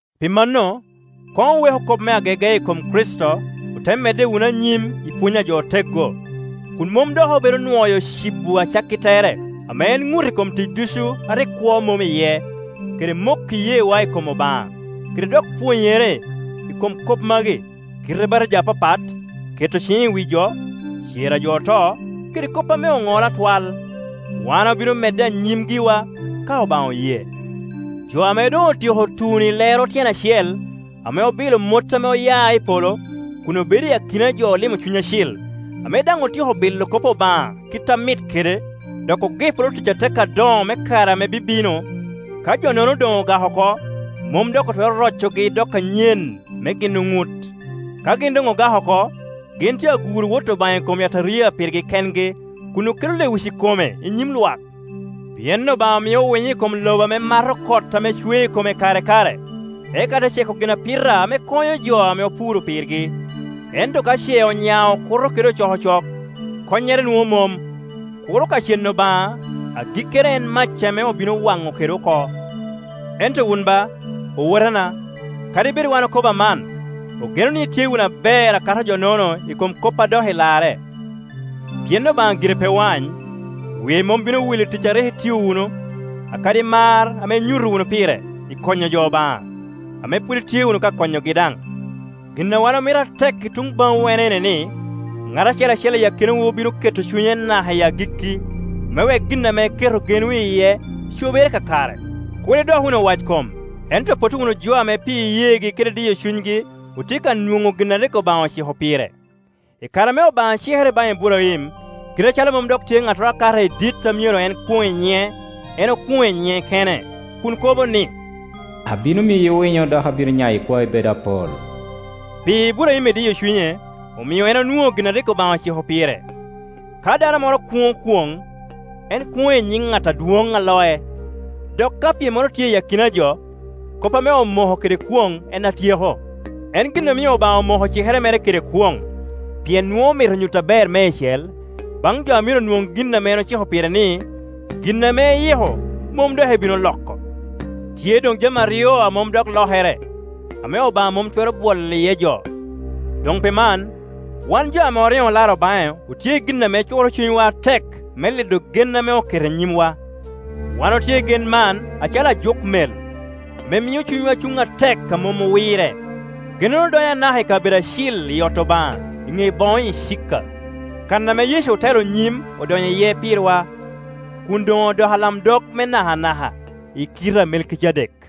Pi mano, koŋ oweku kop me agege i kom Kricito, ote medde wunu anyim i pwony a jo oteggo, kun mom dok obedo nwoyo cibo acakki tere, ame en ŋut i kom tic ducu a rik kwo mom iye, kede moko iyeewa i kom Obaŋa, kede dok pwonyere i kom kop magi: kite batija apapat, keto ciŋ i wi jo, cer a jo oto, kede kop ame oŋolo atwal. Wan obino medde anyim giwa, ka Obaŋa oye. Jo ame doŋ otyeko tuno i lero tyen acel, ame obilo mot ame oya i polo, kun obedo i akina jo olimo Cuny Acil, ame daŋ otyeko bilo kop Obaŋa kit a mit kede, dok ogiporo tic atek adoŋo me kare ame bibino, ka jo-nono doŋ ogak oko, mom dok otwero rocogi dok anyen me gin oŋut. Ka gin doŋ ogak oko, gin tye aguro Wot Obaŋa i kom yataria pirgi kengi, kun okelo lewic i kome i nyim lwak. Pien Obaŋa mio winyo i kom lobo ame mato kot ame cwe i kome kare i kare, eka te ceko ginapita ame konyo jo ame opuro pirgi. Ento ka ce onyao okuto kede ocokocok, konnyere nwoŋo mom, kuro ka ceŋ Obaŋa, agikkere en mac ame obino wano kede oko. Ento wun ba, owotena, kadi bed wan okobo aman, ogeno ni itye wunu aber a kato jo-nono i kom kop a dok i Iarre. Pien Obaŋa gire pe wany; wie mom bino wil i tic a rik itio wunu, akadi mar ame inyuto wunu pire i konyo jo Obaŋa, ame pwod itye wunu ka konyogi daŋ. Gin a wan omito atek i tuŋ baŋwu en ene ni, ŋat acel acel i akinawu bino keto cunye naka i agikki, me wek gin ame iketo genwu iye cobere kakare. Kur idok wunu owackom, ento potto wunu jo ame pi iyeegi kede diyo cunygi otye ka nwoŋo gin a rik Obaŋa ociko pire. I kare ame Obaŋa cikere baŋ Iburaim, kite acalo mom dok tye ŋattoro a kate i dit a myero en kwoŋ i nyiŋe, en okwoŋo i nyiŋe kene, kun kobo ni, “Abino miyi winyo dok abino nyayo ikwai bedo apol.” Pi Iburaim idiyo cunye, omio en onwoŋo gin a rik Obaŋa ociko pire. Ka dano moro kwoŋo kwoŋ, en kwoŋo i nyiŋ ŋat adwoŋ a loc, dok ka pyemmoro tye i akina jo, kop ame omoko kede kwoŋ en a tyeko. En gin omio Obaŋa omoko cikere mere kede kwoŋ, pien nwoŋo omito nyuto aber meicel baŋ jo a myero nwoŋ gin ame eciko pire ni, gin ame eyiko mom dok ebino loko. Tye doŋ jami aryo a mom dok lokere, ame Obaŋa mom twero bwolo jo iye. Doŋ pi man, wan jo ame oriŋo olaro baŋe otye i gin ame cukoro cunywa atek me lido gen ame oketo i nyimwa. Wan otye i gen man acalo ajuk mel, ame mio cunywa cuŋ atek a mom owirre. Gennono donyo anaka i kabedo acil i ot Obaŋa, i ŋe boŋo acika, kan ame Yecu otelo nyim odonyo iye pirwa, kun doŋ odoko alamdog me nakanaka i kite a Melkijadek.